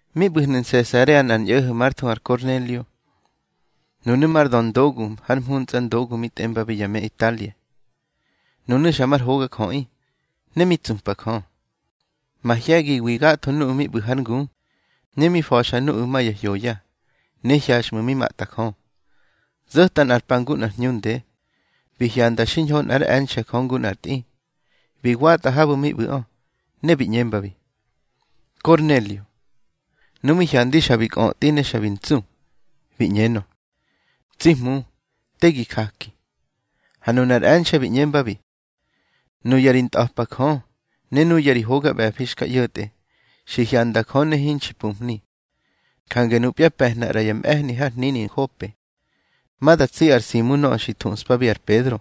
Mi ꞌbu̱hnu̱ Nsesarea nꞌar ñꞌo̱ho̱ már thuhu ar Kornelio. Nunu̱ mar döndogu har mhuntsꞌa ndogu mi tꞌembabi ya me Italia. Nunu̱ xa mar hogajöꞌi, ne mi tsupa Jö, mahye̱giwi gatho nuꞌu̱ mi ꞌbu̱ hár ngu. Ne mi fa̱xa nuꞌu̱ ma ya hyoya, ne hyaxꞌmu̱ mi matꞌa Jö. Zo̱ta nꞌar pa ngu nꞌar hñu nde, bi hyanda xiñho nꞌár e̱nxe̱ Jö ngu nꞌar tꞌi, bi watꞌa habu̱ mi ꞌbu̱ꞌö, ne bi ꞌñembabi: —Kornelio. Nu mi hyandi xa bi kꞌötꞌi ne xa bi ntsu, bi ꞌñenö: —Tsi Hmu, te gi jaki. Ha nunar e̱nxe̱ bi ꞌñembabi: —Nuya ri ntꞌa̱pa Jö, ne nuya ri hoga ꞌbe̱fi xka ꞌyo̱tꞌe, xi hyantꞌa Jö ne hinxi pumhni. Jange nupya pe̱hna ꞌra ya mꞌe̱hni har hnini Nhope, ma da tsi ar Simu nöꞌö xi thuꞌspabi ar Pedro.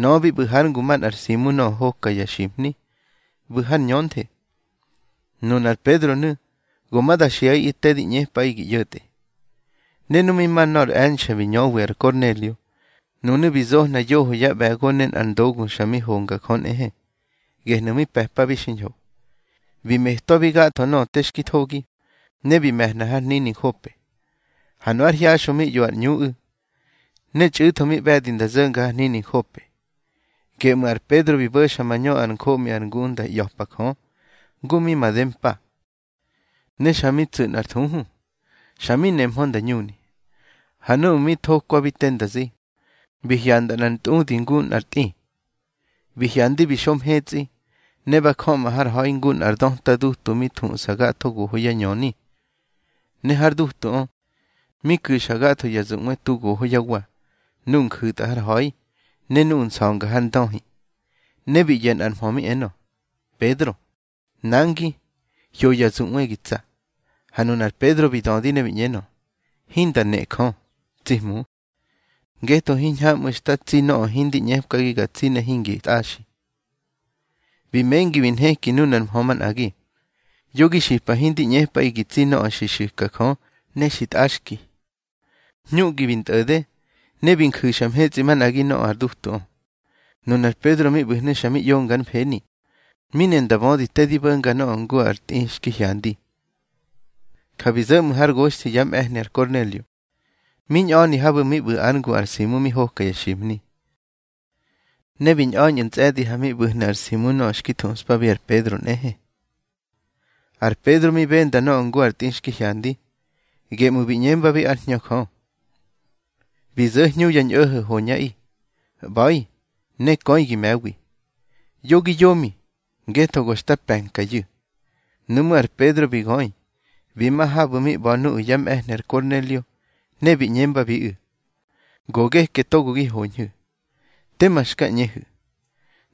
Nöꞌö bi ꞌbu̱ hár ngu manꞌar Simu nöꞌö hoka ya ximhni, ꞌbu̱ har ñönthe. Nunar Pedronu̱ go ma da xiꞌaꞌi te di ꞌñepꞌaꞌi gi ꞌyo̱tꞌe. Ne nu mi ma nor e̱nxe̱ mi ñöwi ar Kornelio, nunu̱ bi zohna yoho yá ꞌbe̱go ne nꞌar ndogu xa mi honga Jö nꞌehe, gehnu̱ mi pe̱pabi xiñho. Bi metwabi gatho nöꞌö te xki thogi, ne bi me̱hna har hnini Nhope. Ha nu ár hyaxꞌö mi ꞌyo ar ꞌñuꞌu̱, ne txꞌu̱tho mi ꞌbe̱di nda zo̱nga har hnini Nhope, geꞌmu̱ ar Pedro bi bo̱xa mañö ár njoꞌmi ar ngu nda ꞌya̱pa Jö, ngu mi made mpa. Ne xa mi tsu̱ nꞌar thuhu, xa mi nemhö nda ñuni. Ha núꞌmu̱ mi thokwabi te nda zi, bi hyanda nꞌar ntꞌudi ngu nꞌar tꞌi. Bi hyandi bi xo mhetsꞌi, ne ba jöꞌma har ha̱i ngu nꞌar döta dutu mi thuꞌsa gatho goho yá ñöni. Ne har dutuꞌö, mi ku̱xa gatho ya zuꞌwe tu goho yá wa, nuꞌu̱ nju̱tꞌa har ha̱i, ne nuꞌu̱ nsa̱nga har ndöhi. Ne bi ꞌyo̱ nꞌar mhö mi enö: —Pedro, nangi, hyo ya zuꞌwe gi tsa. Ha nunar Pedro bi dödi ne bi ꞌñenö: —Hinda nejö, tsi Hmu, ngetho hiñhamꞌu̱ xta tsi nöꞌö hindi ꞌñepki ga tsi ne hingi tꞌaxi. Bi mengi bi nheki nuna ar mhö manꞌagi: —Yo gi xipa hindi ꞌñepꞌaꞌi gi tsi nöꞌö xi xu̱ka Jö ne xi tꞌaxki. Hñuꞌgi bi ntꞌo̱de, ne bi nju̱xa mhetsꞌi manꞌagi nöꞌö ar dutuꞌö. Nunar Pedro mi ꞌbu̱hnu̱ xa mi ꞌyonga ár mfeni, mi ne nda bödi te ndi bo̱nga nöꞌö ngu ar tꞌi xki hyandi. Ja bi zo̱ ꞌmu̱ har goxthi yá mꞌe̱hni ar Kornelio, mi ñꞌa̱ni habu̱ mi ꞌbu̱ ár ngu ar Simu mi hoka ya ximhni. Ne bi ñꞌa̱ñꞌu̱ ntsꞌe̱di, ha mi ꞌbu̱hnu̱ ar Simu nöꞌö xki thuꞌspabi ar Pedro nꞌehe. Ar Pedro mi benda nöꞌö ngu ar tꞌi xki hyandi, geꞌmu̱ bi ꞌñembabi ár Hñö Jö: —Bi zo̱ hñu ya ñꞌo̱ho̱ hoñꞌaꞌi. ꞌBa̱i, ne köi gi me̱wi. Yo gi yomi, ngetho go xta pe̱nkayu̱. Nuꞌmú̱ ar Pedro bi göi bi ma habu̱ mi ꞌba̱ nuꞌu̱ yá mꞌe̱hni ar Kornelio, ne bi ꞌñembabiꞌu̱: —Go geke togo gi hoñhu̱. Tema xka ꞌñehu̱.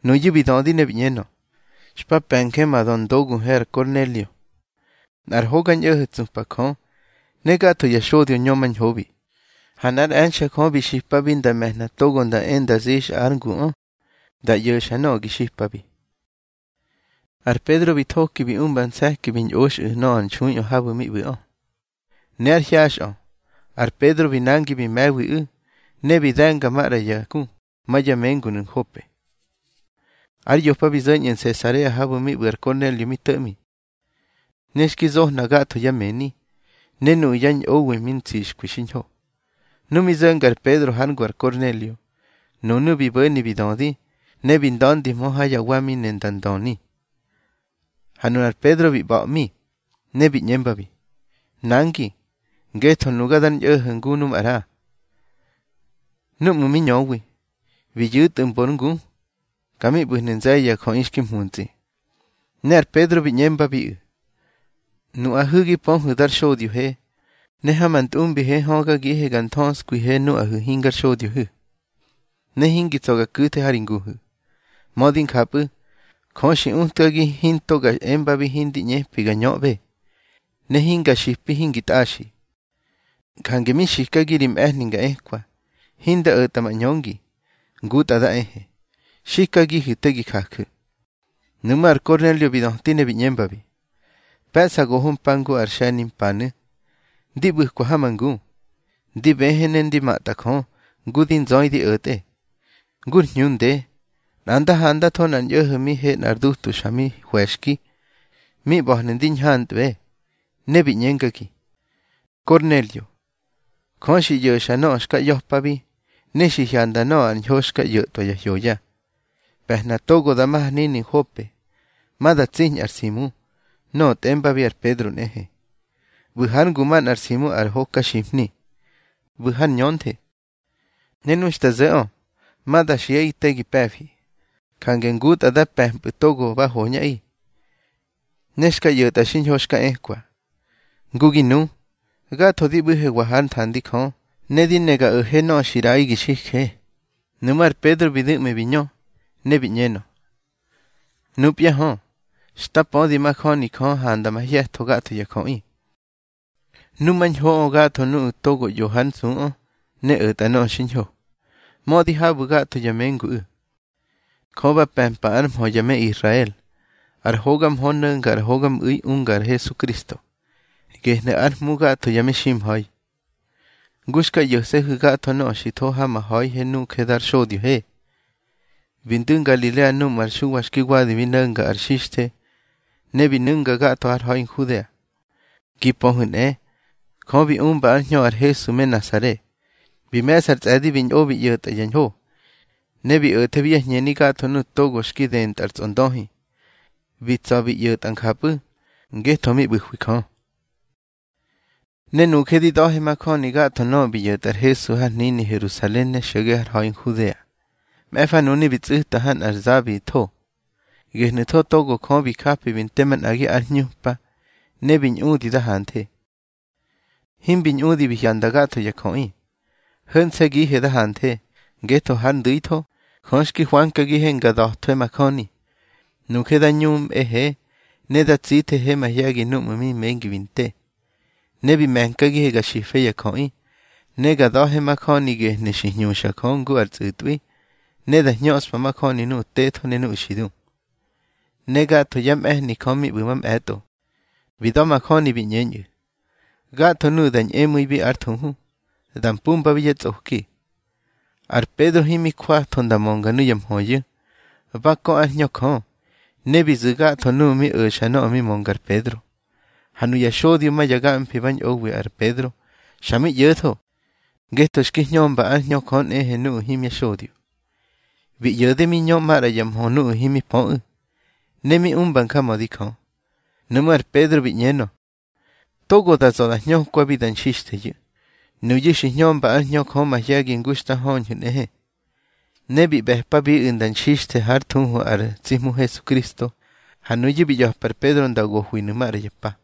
Nuyu̱ bi dödi ne bi ꞌñenö: —Xpa pe̱nje ma döndoguhe ar Kornelio, nꞌar hoga ñꞌo̱ho̱ tsupa Jö, ne gatho ya xodyo ñömañhobi. Ha nꞌár e̱nxe̱ Jö bi xipabi nda me̱hna togo nda e nda zixꞌa ár nguꞌö, da ꞌyo̱xa nöꞌö gi xipabi. Ar Pedro bi thoki bi umba nse̱ki bi ñꞌoxꞌu̱ nöꞌö ar nxuiꞌö habu̱ mi ꞌbu̱ꞌö. Ne ár hyaxꞌö ar Pedro bi nangi bi me̱wiꞌu̱, ne bi de̱nga maꞌra ya ku ma ya mengunu̱ Nhope. Ár yopa bi zo̱ñꞌu̱ Nsesarea habu̱ mi ꞌbu̱ ar Kornelio mi to̱ꞌmi. Ne xki zohna gatho yá mëni, ne nuꞌu̱ yá ñꞌowi mi ntsixkwi xiñho. Nu mi zo̱nga ar Pedro hár ngu ar Kornelio, nunu̱ bi bo̱ni bi dödi, ne bi nda̱ndihmö ha yá wa mi ne nda ndöni. Ha nunar Pedro bi ꞌba̱ꞌmi, ne bi ꞌñembabi: —Nangi, ngetho nuga dar ñꞌo̱ho̱ ngu nu maꞌra. Núꞌmu̱ mi ñöwi, bi yu̱tꞌu̱ mbor ngu. Ka mi ꞌbu̱hnu̱ nze̱ye̱ ya jöꞌi xki mhuntsꞌi. Ne ar Pedro bi ꞌñembabiꞌu̱: —Nuꞌahu̱ gi pöhu̱ dar xodyohe, ne ha ma ntꞌumbihe högagihe ga nthöskwihe nuꞌahu̱ hingar xodyohu̱, ne hingi tsa̱ ga ku̱the ha ri nguhu̱. Mödi njapꞌu̱, Jö xi utkagi hinto ga embabi hindi ꞌñepi ga ñöꞌbe, ne hinga xipi hingi tꞌaxi. Jange mi xikagi ri mꞌe̱hni nga ekwa, hinda o̱tꞌa ma ꞌñöngi, ngutꞌa da ehe. Xikagihu̱ te gi jaju̱. Nuꞌmú̱ ar Kornelio bi döti ne bi ꞌñembabi: —Pe̱ꞌsa goho mpa ngu ar xe̱nimpanu̱, ndi ꞌbu̱kwa ha ma ngu, ndi bëhë ne ndi matꞌa Jö ngu di nzöi di o̱tꞌe. Ngur hñu nde, nꞌa nda handatho nꞌar ñꞌo̱ho̱ mi he nꞌar dutu xa mi hwe̱xki, mi ꞌba̱hnu̱ ndi ñhantꞌbe. Ne bi ꞌñengagi: Kornelio, Jö xi ꞌyo̱xa nöꞌö xka ꞌya̱pabi, ne xi hyanda nöꞌö ar ñho xka ꞌyo̱tꞌwa ya hyoya. Pe̱hna togo da ma har hnini Nhope, ma da tsiñꞌa ar Simu, nöꞌö tꞌembabi ar Pedro nꞌehe. ꞌBu̱ hár ngu manꞌa ar Simu ar hokaximhni, ꞌbu̱ har ñönthe. Ne nu xta zo̱ꞌö, ma da xiꞌa te gi pe̱fi. Jange ngutꞌa da pe̱mpꞌu̱ togo ba hoñꞌaꞌi, ne xka ꞌyo̱tꞌa xiñho xka ekwa. Ngu gi nu, gatho di ꞌbu̱hewa hár nthandi Jö, ne di ne ga o̱he nöꞌö xi ꞌraꞌi gi xije. Nuꞌmú̱ ar Pedro bi du̱ꞌmi bi ñö, ne bi ꞌñenö: —Nupya hö, xta pödi majöni Jö handa mahye̱tho gatho ya jöꞌi. Numañhoꞌö gatho nuꞌu̱ togo ꞌyo hár nsuꞌö ne o̱tꞌa nöꞌö xiñho, mödi habu̱ gatho ya menguꞌu̱. Jö ba pe̱mpa ár mhö ya me Israel, ar hoga mhö no̱nga ar hogamꞌu̱i unga ar Hesukristo, gehnu̱ ár Hmu gatho ya meximha̱i. Ngu xka ꞌyo̱se̱hu̱ gatho nöꞌö xi tho ha ma ha̱ihe nuje dar xodyohe, bi ndu̱ Ngalilea núꞌmu̱ ar Xuwa xki wadi mi no̱nga ar xixthe, ne bi nu̱nga gatho har ha̱i Nhudea. Gi pöhu̱ nꞌe, Jö bi umba ár Hñö ar Hesu me Nasare. Bi me̱ꞌsa ar tsꞌe̱di bi ñꞌo bi ꞌyo̱tꞌa ya ñho, ne bi o̱thebi yá hñeni gatho nuꞌu̱ togo xki dëntꞌa ar tsꞌondöhi. Bi tsa̱ bi ꞌyo̱tꞌa njapꞌu̱, ngetho mi ꞌbu̱hwi Jö. Ne nuje di da̱he majöni gatho nöꞌö bi ꞌyo̱tꞌa ar Hesu har hnini Herusalen ne xo̱ge har ha̱i Nhudea. Mꞌe̱fa nunu̱ bi tsꞌu̱ta ha nꞌar za bi tho. Gehnu̱tho togo Jö bi japi bi nte manꞌagi ár hñupa, ne bi ñꞌudi da hanthe. Himbi ñꞌudi bi hyanda gatho ya jöꞌi. Ho̱nse̱gihe da hanthe, ngetho hár ndu̱itho, Jö xki hwankagihe nga da̱thwe majöni. Nuje da ñumꞌehe ne da tsithehe mahye̱gi núꞌmu̱ mi mengi bi nte. Ne bi me̱nkagihe ga xife ya jöꞌi, ne ga da̱he majöni gehnu̱ xi hñuxa Jö ngu ar tsꞌu̱tꞌwi, ne da hñöꞌspa majöni nuꞌu̱ tetho ne nuꞌu̱ xi du. Ne gatho yá mꞌe̱hni Jö mi ꞌbu̱ mamꞌe̱tꞌo, bi da̱majöni bi ꞌñeñꞌu̱, gatho nuꞌu̱ da ñꞌemu̱ibi ár thuhu, da mpumbabi yá tsꞌoki. Ar Pedro himi jwatho nda mönga nuya mhöyu̱, ba kö ár Hñö Jö, ne bi zu̱ gatho nuꞌu̱ mi o̱xa nöꞌö mi mönga ar Pedro. Ha nuya xodyo ma ya gamfi ba ñꞌowi ar Pedro, xa mi ꞌyo̱tho, ngetho xki hñömba ár Hñö Jö nꞌehe nuꞌu̱ himya xodyo. Bi ꞌyo̱de mi ñö maꞌra ya mhö nuꞌu̱ himi pöꞌu̱, ne mi umba njamödi Jö. Nuꞌmú̱ ar Pedro bi ꞌñenö: —Togo da za̱ da hñökwabi da nxixtheyu̱. Nuyu̱ xi hñömba ár Hñö Jö mahye̱gi ngu xta höñhu̱ nꞌehe. Ne bi ꞌbe̱pabiꞌu̱ nda nxixthe hár thuhu ar tsi Hmu Hesukristo. Ha nuyu̱ bi ꞌya̱pa ar Pedro nda gohwinu̱ maꞌra ya pa.